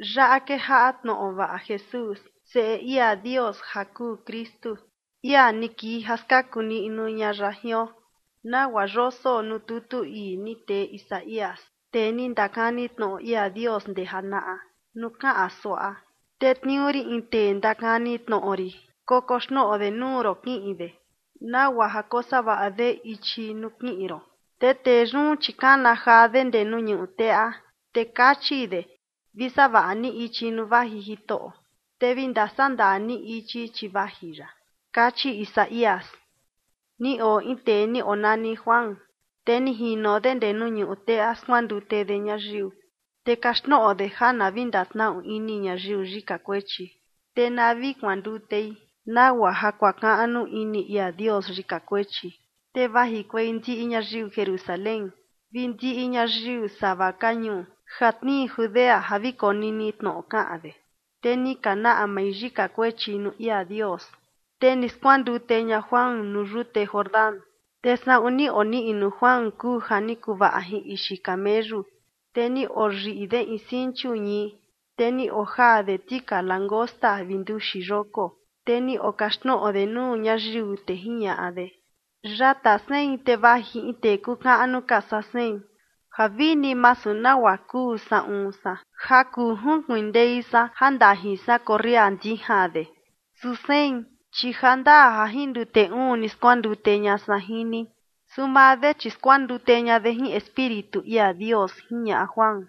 Yaꞌa kejaꞌa tnoꞌo vaꞌa Jesús, Seꞌe ia Dios, ja kuu Kristu, ia ni kii ja skaku niꞌnu ña ya jion, nagua yoso nuu tutu ii ni tee Isaías, tee ni ndakani tnoꞌo ia Dios ndee janaꞌa, nuu kaꞌan suaꞌa: Tetniuu rin in tee ndakani tnoꞌo rin kokoxnoꞌo de nuu ron kiꞌin de, nagua ja kosavaꞌa de ichi nuu kiꞌin ron. Te tee yun, chi kana jaa de ndee nuu ñuꞌu teꞌa, te kachi de: “Vi savaꞌa ni ichi nuu vaji Jitoꞌo, te vi ndasaꞌa ndaa ni ichi, chi vaji ya”, kachi Isaías. Ni oo in tee ni onani Juan, te ni jino de ndee nuu ñuꞌu teꞌa skuandute de ñayiu, te kaxtnoꞌo de ja na vi ndatnaꞌu ini ñayiu yika kuechi, te na vi kuandutei nagua ja kuakaꞌnu ini ia Dios yika kuechi. Te vajikuei ndiꞌi ñayiu Jerusalén vi ndiꞌi ñayiu sava ka ñuu ja tnii Judea ja vi konini tnoꞌo kaꞌan de. Te ni ka naꞌmai yika kuechi nuu ia Dios, te ni skuandute ña Juan nuu yute Jordán. Te saꞌun ni oniꞌnu Juan kuu ja ni kuvaꞌa jin ixi kameyu, te ni oyiꞌi de in sinchu ñii, te ni ojaa de tika langosta vi nduxi yoko. Te ni okaxtnoꞌo de nuu ñayiu, te jiñaꞌa de: ―Yata sein te vaji in tee kuu kaꞌnu ka saa sein, ja vini masu nagua kuu saꞌun san ja kuu junkuindei san ja ndajin san korria ndijan de. Su sein, chi ja ndaa ja jin ndute uun ni skuandute ña san jin ni, su maa de, chi skuandute ña de jin Espíritu ia Dios ―jiñaꞌa Juan.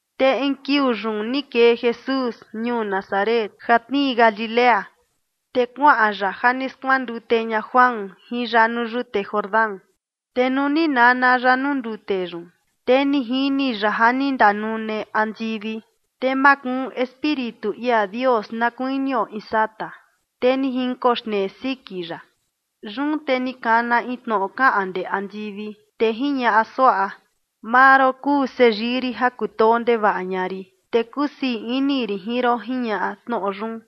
Te in kiuu yun ni kee Jesús ñuu Nazaret, ja tnii Galilea, te kuaꞌan ya ja ni skuandute ña Juan jin ya nuu yute Jordán. Te nuu ni nana ya nuu ndute yun, te ni jini ya ja ni ndanune andivi, te makuun Espíritu ia Dios na kuinio in sata, te ni jinkoxnee siki ya. Yun te ni kana in tnoꞌo kaꞌan ndee andivi, te jiñaꞌa suaꞌa: ―Maa ron kuu seyii rin ja kutoo ndevaꞌa ña rin, te kusii ini rin jin ron ―jiñaꞌa tnoꞌo yun.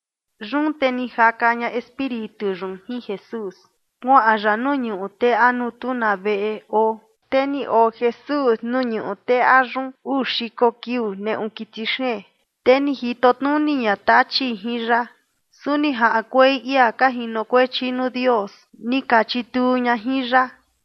Yun te ni jaka ña Espíritu yun jin Jesús kuaꞌan ya nuu ñuꞌu teꞌa nuu tu na veꞌe oo. Te ni oo Jesús nuu ñuꞌu teꞌa yun uu xiko kiuu neꞌu kiti xeen, te ni jito tnuni ña Tachi jin ya. Su ni jaꞌankuei ia ka jinokuechi nuu Dios, ni ka chituu ña jin ya.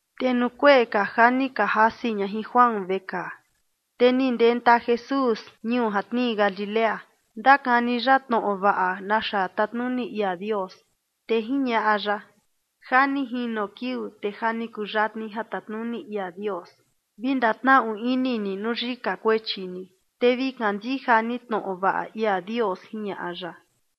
Te nuu kuee ka ja ni ka jasi ña jin Juan vekaa, te ni ndenta Jesús ñuu ja tnii Galilea, ndakani ya tnoꞌo vaꞌa naxa tatnuni ia Dios. Te jiñaꞌa ya: ―Ja ni jino kiuu, te ja ni kuyatni ja tatnuni ia Dios. Vi ndatnaꞌu ini ni nuu yika kuechi ni, te vi kandija ni tnoꞌo vaꞌa ia Dios ―jiñaꞌa ya.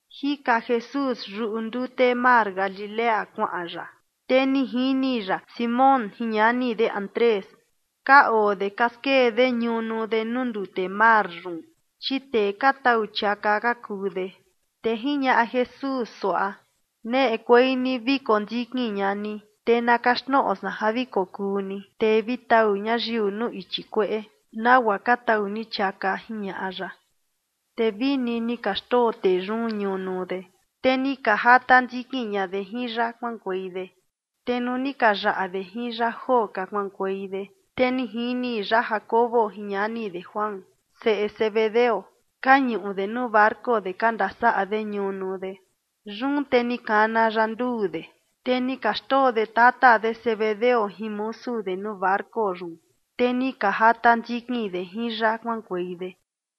Jika Jesús yuꞌu ndute mar Galilea kuaꞌan ya, te ni jini ya Simón jin ñani de Andrés. Ka oo de ka skee de ñunu de nuu ndute mar yun, chi tee ka tau chiaka ka kuu de. Te jiñaꞌa Jesús suaꞌa: ―Neꞌekuei ni vi kondikin ña ni, te na kaxtnoꞌo san ja vi kokuu ni tee vi tau ñayiu nuu ichi kueꞌe, nagua ka tau ni chiaka ―jiñaꞌa ya. Te vini ni ka xndoo tee yun ñunu de, te ni ka jata ndikin ña de jin ya kuaꞌankuei de. Te nuu ni ka yaꞌa de jin ya joo ka kuaꞌankuei de, te ni jini ya Jacobo jin ñani de Juan, seꞌe Zebedeo, ka ñuꞌu de nuu barco de ka ndasaꞌa de ñunu de. Yun te ni kana ya nduu de, te ni ka xndoo de tata de Zebedeo jin musu de nuu barco yun, te ni ka jata ndikin de jin ya kuaꞌankuei de.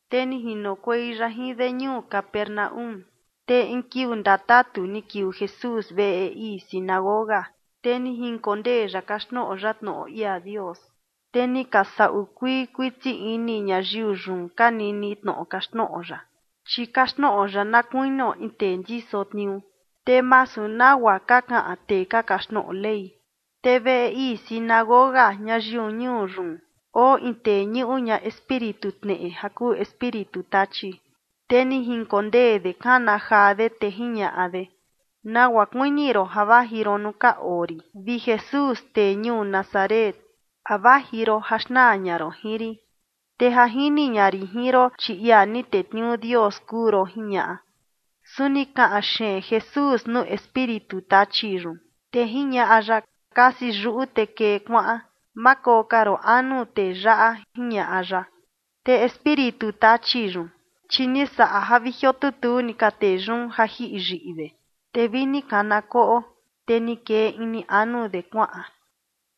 Te ni jinokuei ya jin de ñuu Capernaúm, te in kiuu ndatatu ni kiuu Jesús veꞌe ii sinagoga, te ni jinkondee ya kaxtnoꞌo ya tnoꞌo ia Dios. Te ni ka saꞌu kuii kuiti ini ñayiu yun ka nini tnoꞌo kaxtnoꞌo ya, chi kaxtnoꞌo ya na kuinio in tee ndiso tniuu, te masu nagua ka kaꞌan tee ka kaxtnoꞌo Ley. Te veꞌe ii sinagoga ñayiu ñuu yun oo in tee ñuꞌu ña espíritu tneꞌe ja kuu espíritu tachi, te ni jinkondee de kana jaa de. Te jiñaꞌa de: ―¿Nagua kuini ron ja vaji ron nuu ka oo rin, vi Jesús, tee ñuu Nazaret? ¿A vaji ron ja xnaa ña ron jin rin? Te ja jini ña rin jin ron, chi ia ni tetniuu Dios kuu ron ―jiñaꞌa. Su ni kaꞌan xeen Jesús nuu espíritu tachi yun, te jiñaꞌa ya: ―Kasi yuꞌu te kee kuaꞌan. Ma koo ka ron anu tee yaꞌa ―jiñaꞌa ya. Te espíritu tachi yun, chi ni saꞌa ja vi jiotutuu ni ka tee yun ja jiꞌi yiꞌi de, te vi ni kana koꞌo, te ni kee ini anu de kuaꞌan.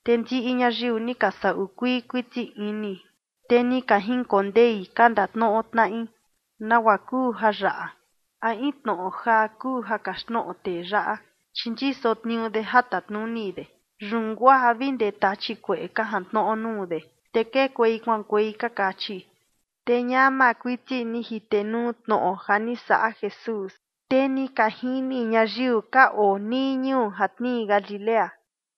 Te ndiꞌi ñayiu ni ka saꞌu kuii kuiti ini, te ni ka jinkondei ka ndatnoꞌo tnaꞌi: ―¿Nagua kuu jayaꞌa? ¿A in tnoꞌo jaa kuu ja kaxtnoꞌo tee yaꞌa? Chi ndiso tniuu de ja tatnuni de, yun guaa vi ndee tachi kueꞌe ka jantnoꞌo nuu de, te kekuei kuaꞌankuei ―ka kachi. Te ñama kuiti ni jitenuu tnoꞌo ja ni saꞌa Jesús, te ni ka jini ñayiu ka oo nii ñuu ja tnii Galilea.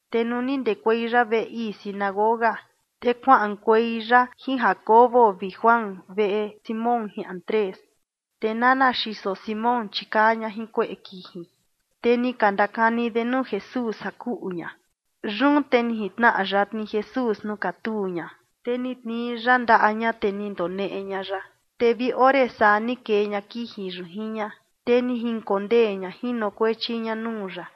Te nuu ni ndekuei ya veꞌe ii sinagoga, te kuaꞌankuei ya jin Jacobo vi Juan, veꞌe Simón jin Andrés. Te nana xiso Simón, chi kaa ña jin kueꞌe kiji, te ni ka ndakani de nuu Jesús ja kuꞌu ña. Yun te ni jintnaꞌa yatni Jesús nuu katuu ña, te ni tnii ya ndaꞌa ña, te ni ndoneꞌe ña ya, te vi ore saa ni kee ña kiji yun jin ña, te ni jinkondee ña jinokuechi ña nuu ya.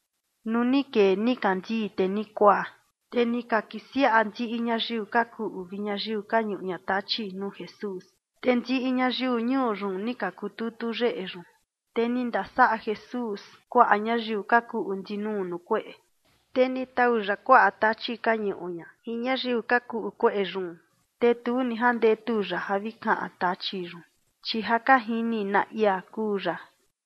Nuu ni kee nikandii te ni kuaa, te ni ka kisiaꞌa ndiꞌi ñayiu ka kuꞌu vi ñayiu ka ñuꞌu ña tachi nuu Jesús. Te ndiꞌi ñayiu ñuu yun ni ka kututu yeꞌe yun. Te ni ndasaꞌa Jesús kuaꞌa ñayiu ka kuꞌu ndinuu nuu kueꞌe, te ni tau ya kuaꞌa tachi ka ñuꞌu ña jin ñayiu ka kuꞌu kueꞌe yun. Te tu ni jandetu ya ja vi kaꞌan tachi yun, chi ja ka jini na ia kuu ya.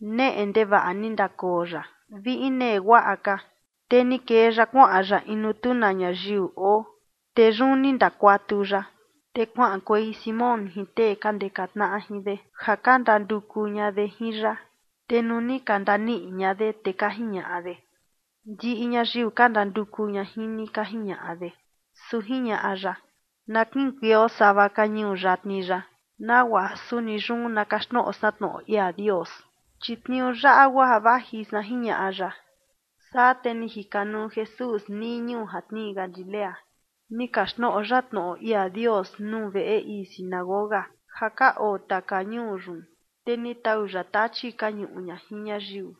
Neꞌe ndevaꞌa ni ndakoo ya, vi inee guaꞌa ka, te ni kee ya kuaꞌan ya in nuu tu na ñayiu oo, te yun ni ndakuatu ya. Te kuaꞌankuei Simón jin tee ka ndeka tnaꞌa jin de ja ka ndanduku ña de jin ya. Te nuu ni ka ndaniꞌi ña de, te ka jiñaꞌa de: ―Ndiꞌi ñayiu ka ndanduku ña jin ni ―ka jiñaꞌa de. Su jiñaꞌa ya: ―Na kiꞌinkueio sava ka ñuu yatni yaꞌa, nagua ja suni yun na kaxtnoꞌo san tnoꞌo ia Dios, chi tniuu yaꞌa guaa ja vaji san ―jiñaꞌa ya. Saa te ni jikanuu Jesús nii ñuu ja tnii Galilea, ni kaxtnoꞌo ya tnoꞌo ia Dios nuu veꞌe ii sinagoga ja ka oo taka ñuu yun, te ni tau ya tachi ka ñuꞌu ña jin ñayiu.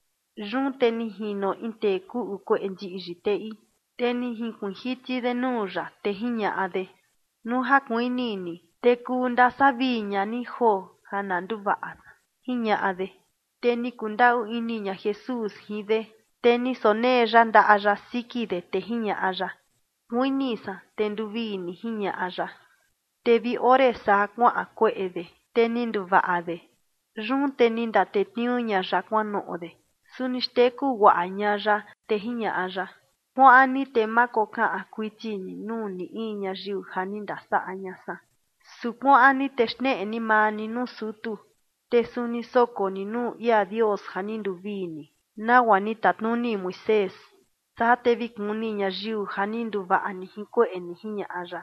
Yun te ni jino in tee kuꞌu kueꞌe ndiꞌyi teꞌi, te ni jinkuiin jiti de nuu ya, te jiñaꞌa de: ―Nuu ja kuini ni, te kuu ndasavii ña ni joo ja na nduvaꞌa san ―jiñaꞌa de. Te ni kundaꞌu ini ña Jesús jin de, te ni sonee ya ndaꞌa ya siki de, te jiñaꞌa ya: ―Kuini san, te nduvii ni ―jiñaꞌa ya. Te vi ore saa kuaꞌan kueꞌe de, te ni nduvaꞌa de. Yun te ni ndatetniuu ña ya kuanoꞌo de, su ni xteku guaꞌa ña ya, te jiñaꞌa ya: ―Kuaꞌan ni te ma kokaꞌan kuiti ni nuu ni in ñayiu ja ni ndasaꞌa ña san. Su kuaꞌan ni te xneꞌe ni maa ni nuu sutu, te suni soko ni nuu ia Dios ja ni nduvii ni, nagua ni tatnuni Moisés, saa te vi kuni ñayiu ja ni nduvaꞌa ni jin kueꞌe ni ―jiñaꞌa ya.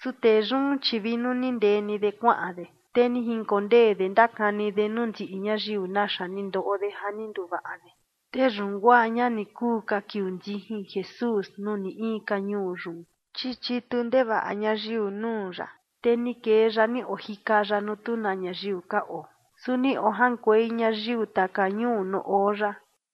Su tee yun, chi vi nuu ni ndee de kuaꞌan de, te ni jinkondee de ndakani de nuu ndiꞌi ñayiu naxa ni ndoꞌo de ja ni nduvaꞌa de. Te yun guaa ña ni kuu ka kiuu ndijin Jesús nuu ni in ka ñuu yun, chi chitu ndevaꞌa ñayiu nuu ya, te ni kee ya ni ojika ya nuu tu na ñayiu ka oo, su ni ojaꞌankuei ñayiu taka ñuu nuu oo ya.